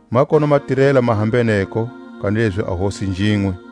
Ma kona matirela ma hambeneko, kanilezi a Hosi njinwe.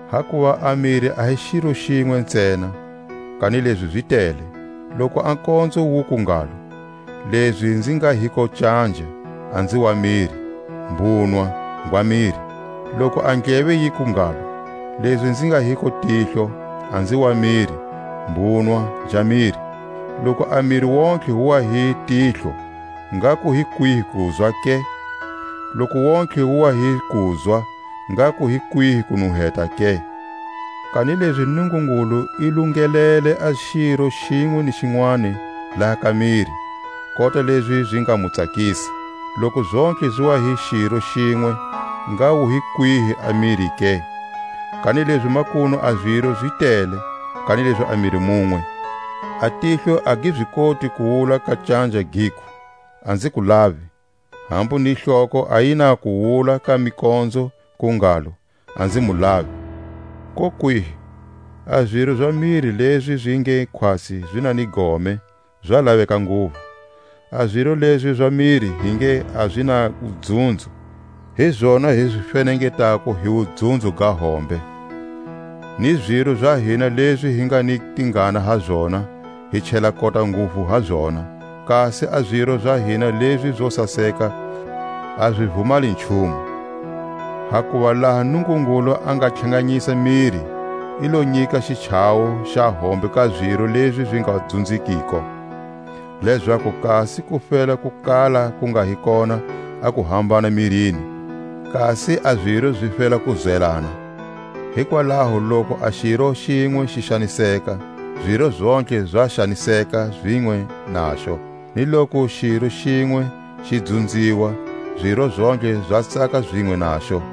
Hakuva a miri a hi xiro xinwe ntsena, kanilezi zi tele. Loku a konzo wuku ngalo: Lezi nzi nga hiko canja, a nzi wa miri; mbunwa, ngwa miri. Loku a ndleve yiku ngalo: Lezi nzi nga hiko tihlo, a nzi wa miri; mbunwa, nja miri. Loku a miri wontihe wu wa hi tihlo, ngha ku hi kwihi kuzwa ke? Loku wontihe wu wa hi kuzwa, ngha ku hi kwihi kunuheta ke? Kanilezi Nungungulu i lungelele a xiro xinwe ni xinwani laha ka miri, kota lezi zi nga mu tsakisa. Loku zontlhe zi wa hi xiro xinwe, ngha wu hi kwihi a miri ke? Kanilezi makunu a ziro zi tele, kanilezi a miri munwe. A tihlo a gi zi koti ku wula ka canja, giku: A nzi ku lavi; hambu ni hloko a yi na ku wula ka mikonzo ku ngalo: A nzi mu lavi. Kokwihi! A ziro za miri lezi zi nge khwatsi zi na ni gome, za laveka nguvu. A ziro lezi za miri hi nge a zi na wudzunzo, hi zona hi zi fenengetako hi wudzunzo ga hombe; ni ziro za hina lezi hi nga ni tingana ha zona, hi chela kota nguvu ha zona, kasi a ziro za hina lezi zo saseka a zi vumali nchumu. Hakuva laha Nungungulu a nga tlhanganyisa miri, i lo nyika xichawo xa hombe ka ziro lezi zi nga dzunzekiko, lezaku kasi ku fela ku kala ku nga hi kona a kuhambana mirini; kasi a ziro zi fela ku zwelana. Hikwalaho loku a xiro xinwe xi xaniseka, ziro zontlhe zi xaniseka zinwe naxo; ni loku xiro xinwe xi dzunziwa, ziro zontlhe zi tsaka zinwe naxo.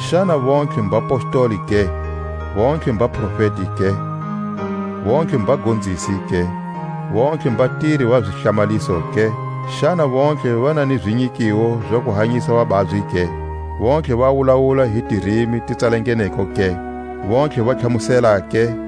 Xana vontlhe mbapostoli ke? vontlhe mbaprofeti ke? vontlhe mbagonzisi ke? vontlhe mbatiri va zihlamaliso ke? Xana vontlhe va na ni zinyikiwo za ku hanyisa vababyi ke? vontlhe va wulawula hi tirimi ti tsalangeneko ke? vontlhe va tlhamusela ke?